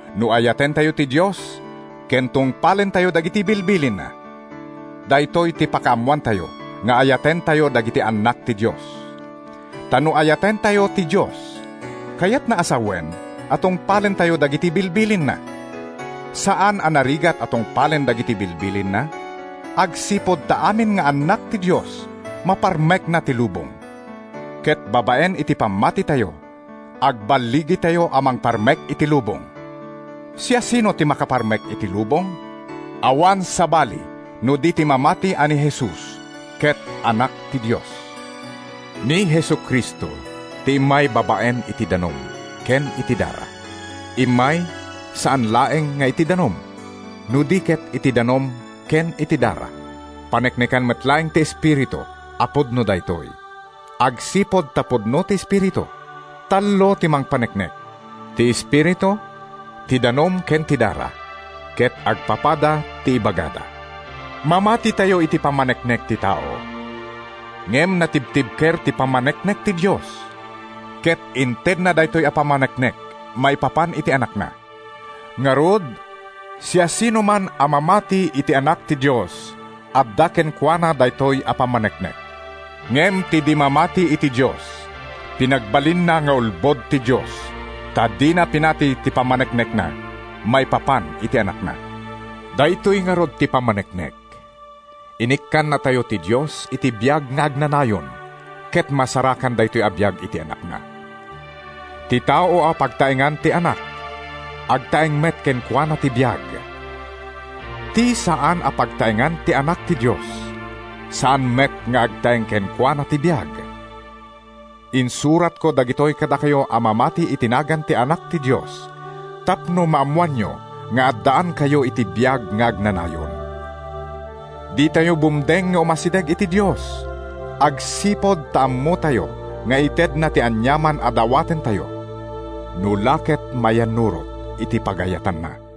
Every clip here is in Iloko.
No ayatentayo ti Dios ken tungpalentayo dagiti bilbilinna, daytoy ti pakaammoantayo nga ayatentayo dagiti annak ti Dios. Ta no ayatentayo ti Dios, kayatna a sawen a tungpalentayo dagiti bilbilinna. Saan a narigat a tungpalen dagiti bilbilinna, agsipud ta amin nga anak ti Dios maparmekna ti lubong. Ket babaen iti pammatitayo, agballigitayo a mangparmek iti lubong. Siasino ti makaparmek iti lubong? Awan sabali no di ti mamati a ni Jesus ket Anak ti Dios. Ni Jesu-Cristo ti immay babaen iti danum ken iti dara. Immay, saan laeng nga iti danum, no di ket iti danum ken iti dara. Paneknekan met laeng ti Espiritu a pudno daytoy, agsipud ta pudno ti Espiritu. Tallo ti mangpaneknek: ti Espiritu, ti danum ken ti dara. Ket agpapada ti ibagada. Mamatitayo iti pammaneknek ti tao. Ngem natibtibker ti pammaneknek ti Dios, ket intedna daytoy a pammaneknek maipapan iti Anakna. Ngarud, siasinoman a mamati iti Anak ti Dios adda kenkuana daytoy a pammaneknek. Ngem ti di mamati iti Dios, pinagbalinna nga ulbod ti Dios, ta dina pinati ti pammaneknekna maipapan iti Anakna. Daytoy ngarud ti pammaneknek: Inikkannatayo ti Dios iti biag nga agnanayon, ket masarakan daytoy a biag iti Anakna. Ti tao a pagtaengan ti Anak, agtaeng met kenkuana ti biag; ti saan a pagtaengan ti Anak ti Dios, saan met nga agtaeng kenkuana ti biag. Insuratko dagitoy kadakayo a mamati iti nagan ti Anak ti Dios, tapno maammoanyo nga addaankayo iti biag nga agnanayon. Ditayo bumdeng nga umasideg iti Dios agsipud ta ammotayo nga itedna ti aniaman a dawatentayo no la ket mayannurot iti pagayatanna.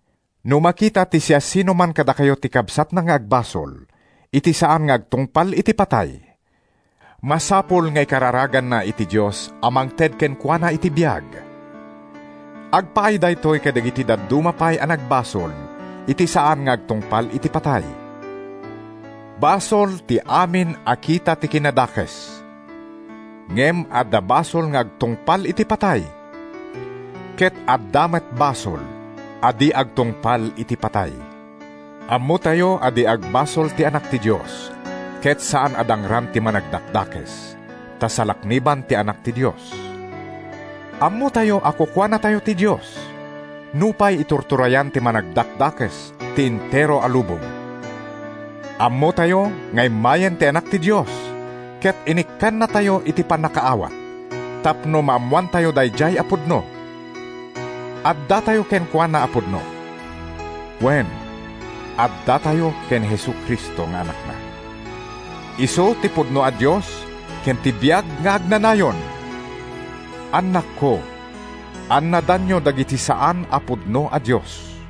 No makita ti siasinoman kadakayo ti kabsatna nga agbasol iti saan nga agtungpal iti patay, masapul nga ikararaganna iti Dios a mangted kenkuana iti biag. Agpaay daytoy kadagiti dadduma pay a nagbasol iti saan nga agtungpal iti patay. Basol ti amin a kita ti kinadakes. Ngem adda basol nga agtungpal iti patay, ket adda met basol a di agtungpal iti patay. Ammotayo a di agbasol ti anak ti Dios, ket saan a dangran ti Managdakdakes, ta salakniban ti Anak ti Dios. Ammotayo a kukuanatayo ti Dios, nupay iturturayan ti Managdakdakes ti entero a lubong. Ammotayo nga immayen ti Anak ti Dios, ket inikkannatayo iti pannakaawat tapno maammoantayo daydiay a pudno. Addatayo kenkuana a pudno, wen, addatayo ken ni Jesu-Cristo nga Anakna. Isu ti pudno a Dios ken ti biag nga agnanayon. Annakko, annadanyo dagiti saan a pudno a dios.